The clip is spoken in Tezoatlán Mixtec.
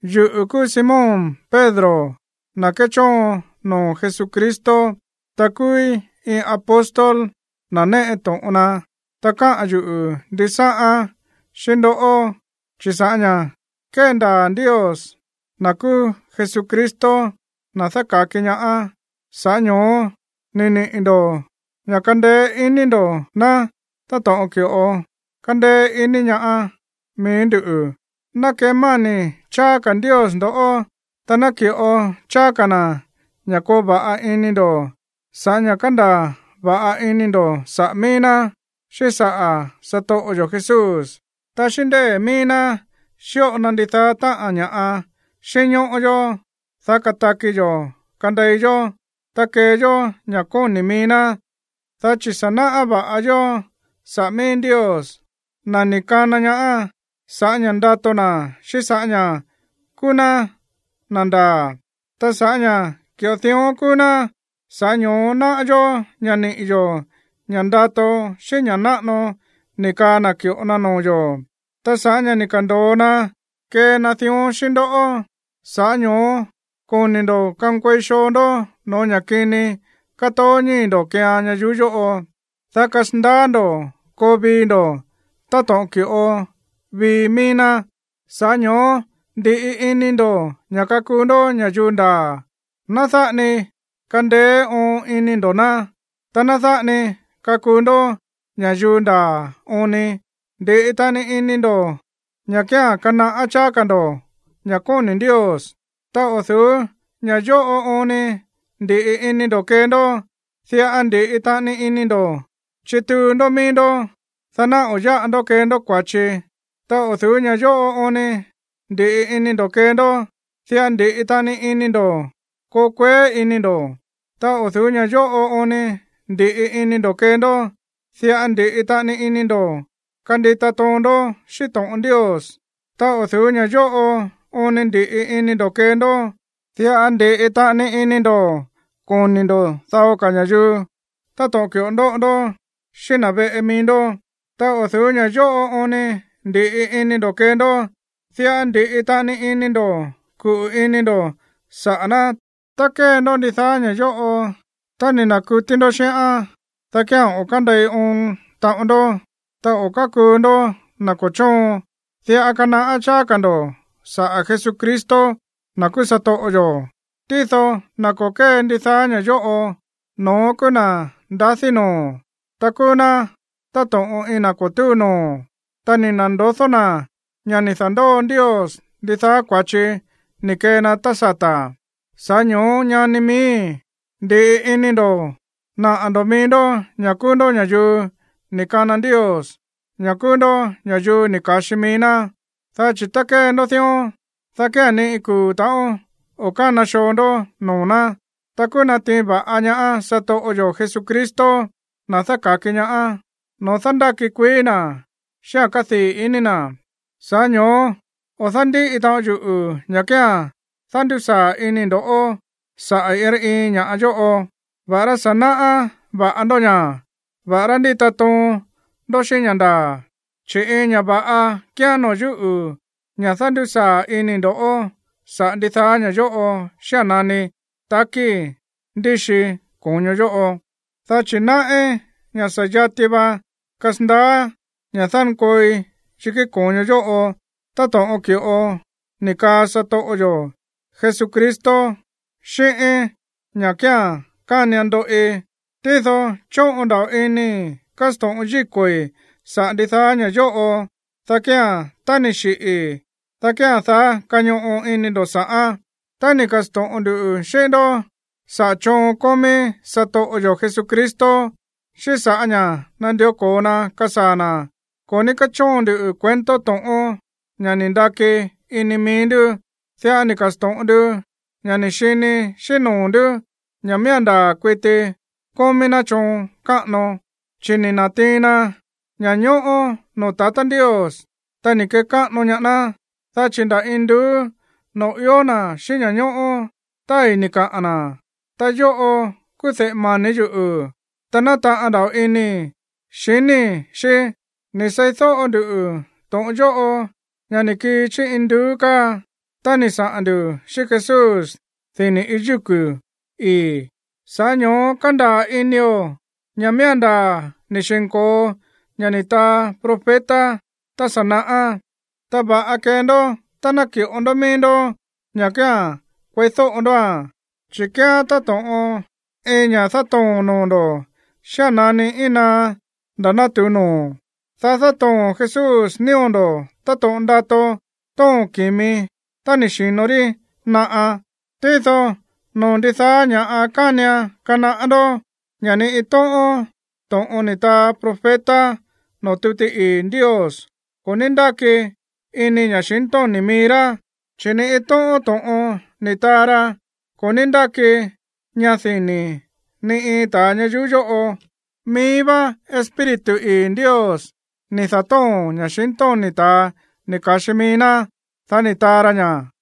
Yuꞌu̱ kúú Simón Pedro, na̱ kéchóon noo̱ Jesucristo. Ta kúúí iin apóstol, na̱ néꞌe to̱ꞌon na. Ta káꞌa̱n yuꞌu̱ ndisáꞌán xíꞌín ndoꞌó, chi̱ sa̱ꞌá ña̱ kéndaa̱ Ndios, na̱ kúú Jesucristo, na̱ dáka̱ki ñaá, sa̱ꞌá ño̱ó ni̱ niꞌi̱ ndo̱ ña̱ kándéé iní ndo̱ ná táto̱ꞌon ki̱ꞌo kándéé iní ñaá mií ndú. Ná kemáni̱ cháá ka̱ Ndios ndo̱ꞌó, ta ná ki̱ꞌo cháá ka̱ na̱ ña̱ koo va̱ꞌa ini ndo̱ sa̱ꞌá ña̱ kándaa̱ va̱ꞌa ini ndo̱ saꞌa̱ míí ná, xíꞌín saꞌa̱ satoꞌo yo̱ Jesús. Ta xíꞌín ndée̱ míí ná xíꞌo na ndidaá táꞌa̱n ña̱ꞌa xínñóꞌó yó, dá kataki yo̱ kandei yó, ta kee yó ña̱ kóni̱ mií ná, dá chi̱ sa̱ náꞌá va̱ꞌa yó saꞌa̱ míí Ndios, na̱ ni̱ kana ñaá sa̱ꞌá ña̱ ndato na̱ xíꞌín sa̱ꞌá ña̱ kúú ná na̱ ndaa̱. Ta sa̱ꞌá ña̱ ki̱ꞌo dión kúú ná, sa̱ꞌá ño̱ó náꞌá yó ña̱ niꞌi̱ yo̱ ña̱ ndato xíꞌín ña̱ náꞌano ni̱ kaa na̱ ki̱ꞌo na noo̱ yo̱. Ta sa̱ꞌá ña̱ ni̱ ka̱ndo̱o na kee na dión xíꞌín ndó, sa̱ꞌá ño̱ó koni ndo̱ kankuei xoo ndó no̱ó ña̱ kini kátoó ñíi̱ ndo̱ keean ñayuú yóꞌo, dá kasandaá ndo̱ koo vii ndo̱ táto̱ꞌon ki̱ꞌo vii mií ná. Sa̱ꞌá ño̱ó ndi̱ꞌi ini ndo̱ ña̱ kakuu ndó ña̱yuu ndaa̱, ná dáꞌa ni kandeé oon ini ndo̱ ná. Ta ná dáꞌa ni kakuu ndó ña̱yuu ndaa̱ oon ni, ndi̱ꞌi taꞌani ini ndo̱ ña̱ kía̱n kanaꞌá cháá ka̱ ndo̱ ña̱ kóni̱ Ndios, ta o̱ du̱ú ña̱ yóꞌo oon ni ndi̱ꞌi ini ndo̱ kee ndó, diꞌa ndi̱ꞌi taꞌani ini ndo̱ chituu ndó mií ndó, dá ná o̱ yáꞌa ndó kee ndó kua̱chi. Ta o̱ du̱ú ña̱ yóꞌo oon ni ndi̱ꞌi ini ndo̱ kee ndó, diꞌa ndi̱ꞌi taꞌani ini ndo̱ koo kueé iní ndo̱. Ta o̱ du̱ú ña̱ yóꞌo oon ni ndi̱ꞌi ini ndo̱ kee ndó, diꞌa ndi̱ꞌi taꞌani ini ndo̱ kandita toon ndó xíꞌín to̱ꞌon Ndios. Ta o̱ du̱ú ña̱ yóꞌo oon ni ndi̱ꞌi ini ndo̱ kee ndó, diꞌa ndi̱ꞌi taꞌani ini ndo̱ koni̱ ndo̱ dao ka̱ ña̱yuu táto̱ꞌon ki̱ꞌo ndóꞌo ndó xíꞌín na̱ veꞌe mií ndó. Ta o̱ du̱ú ña̱ yóꞌo oon ni ndi̱ꞌi ini ndo̱ kee ndó, diꞌa ndi̱ꞌi taꞌani ini ndo̱ kuꞌu̱ ini ndo̱ saꞌa̱ ná. Tá kée ndó ndidaá ña̱ yóꞌo, ta ni̱ na̱kutí ndó xíꞌán, dá kía̱n o̱ kándei oon taꞌon ndó, ta o̱ kákuu ndó na̱ ko̱ chóon. Diꞌa kanaꞌá cháá ka̱ ndo̱ saꞌa̱ Jesucristo, na̱ kúú satoꞌo yo̱. Tído na̱ ko̱ kée ndidaá ña̱ yóꞌo, no̱ón kúú na̱ ndadí noo̱, ta kúú ná táto̱ꞌon iin na̱ ko̱ túu noo̱, ta ni̱ na̱ndodó na̱ ña̱ ni̱ da̱ndóo Ndios ndidaá kua̱chi ni̱ kee na tá sata̱. Sa̱ꞌá ño̱ó, ñani miíi̱, ndi̱ꞌi ini ndo̱ naꞌa̱ ndo̱ mií ndó ña̱ kúú ndó ña̱yuu ni̱ kana Ndios, ña̱ kúú ndó ña̱yuu ni̱ ka̱xi mií ná. Dá chi̱ tá kee ndó dión, dá kía̱n ni iin kuu̱ ta̱ꞌón o̱ kána xoo ndó noo̱ ná. Ta kúú natiin va̱ꞌa ñaá satoꞌo yo̱ Jesucristo, na̱ dáka̱ki ñaá, noo̱ dándáki kuií na̱ xíꞌa̱n kádii̱ ini na̱. Sa̱ꞌá ño̱ó o̱ dándíꞌi taꞌon yuꞌu̱ ña̱ kía̱n dándusaa̱ inii̱ ndo̱ꞌó saꞌa̱ iin rá iin ña̱ꞌa yóꞌo, va̱ꞌará sa̱ náꞌá va̱ꞌa ndó ña̱, ta va̱ꞌará ndíta toon ndó xíꞌín ña̱ ndaa̱. Chi̱ iin ña̱ va̱ꞌa kíán noo̱ yúꞌu̱ ña̱ dándusaa̱ inii̱ ndo̱ꞌó saꞌa̱ ndidaá ña̱ yóꞌo xía̱n nani takíi̱ ndíxii ko̱ño yóꞌo. Dá chi̱ náꞌí ña̱ sa̱ yati va kasandaá ña̱ dánkooi yikí ko̱ño yóꞌo táto̱ꞌon ki̱ꞌo ni̱ kaꞌa̱n satoꞌo yo̱ Jesucristo xíꞌíín ña̱ kía̱n kánian ndoꞌi. Tído chóꞌon nda̱ꞌo inii̱ kásto̱ꞌon yíko̱i̱ saꞌa̱ ndidaá ña̱ yóꞌo, dá kía̱n, tá ni̱ xiꞌi̱i̱, dá kía̱n daá kañoꞌo ini ndo̱ sa̱ꞌán. Tá ni̱ ka̱sto̱ꞌon ndu xíꞌín ndó saꞌa̱ choon kómí satoꞌo yo̱ Jesucristo, xíꞌín sa̱ꞌá ña̱ nandió ko̱o na kasaa̱ na̱, ko̱ ní kéchóon ndu cuento to̱ꞌón, ña̱ ni̱ ndaki ini mií ndú. Diꞌa ni̱ ka̱sto̱ꞌon ndu ña̱ ni̱ xini xíꞌín noo̱ ndú ña̱ miía̱n ndaa̱ kuiti kómí ná choon káꞌano. Chi̱ ni̱ na̱tiin na ña̱ñóꞌó noo̱ tatá Ndios, ta ni̱ kekáꞌano ñaá ná, dá chi̱ nda̱ induú noo̱ ió na̱ xíꞌín ña̱ñóꞌó tái̱ ni̱ kaꞌa̱n na̱: “Ta yóꞌo kúú de̱ꞌe mani̱ yuꞌu̱, ta nátaꞌan nda̱ꞌo inii̱ xiníi̱ xí.” Ni̱ seídóꞌo nduꞌu̱ to̱ꞌon yóꞌo, ña̱ ni̱ kii chí induú káa, tá ni̱ saꞌa̱n ndu̱ xíꞌín Jesús dini̱ iin yúku̱ ii̱. Sa̱ꞌá ño̱ó kándaa̱ inio̱ ña̱ miía̱n ndaa̱ ni̱ xi̱nko̱o ña̱ ni̱ taa profeta tá sa̱ naꞌá. Ta va̱ꞌa kee ndó tá ná ki̱ꞌo ndó mií ndó ña̱ kía̱n kueídóꞌo ndóa̱n, chi̱ kíán táto̱ꞌon iin ña̱ dátoo̱n noo̱ ndo̱ xía̱n nani íin naá nda̱ natu̱u noo̱, dá dátoo̱n Jesús nío̱ ndo̱ táto̱ꞌon ndato tóo̱n ki̱mi tá ni̱ xi̱no rí naꞌa. Tído noo̱ ndidaá ña̱ꞌa kánian kanaꞌá ndó ña̱ ni iin tóꞌón to̱ꞌon ni̱ taa profeta noo̱ tuti ii̱ Ndios ko̱ ní ndáki ini ña̱xintóni̱ mií rá, chi̱ ni iin tóꞌón to̱ꞌon ni̱ taa ra ko̱ ní ndáki ña dini̱ ni iin ta̱a ñayuú yóꞌo. Mií vá Espíritu ii̱ Ndios ni̱ da̱tóo̱n ña̱xintóni̱ ta̱a ni̱ ka̱xi mií ná, dá ni̱ taa ra ña̱.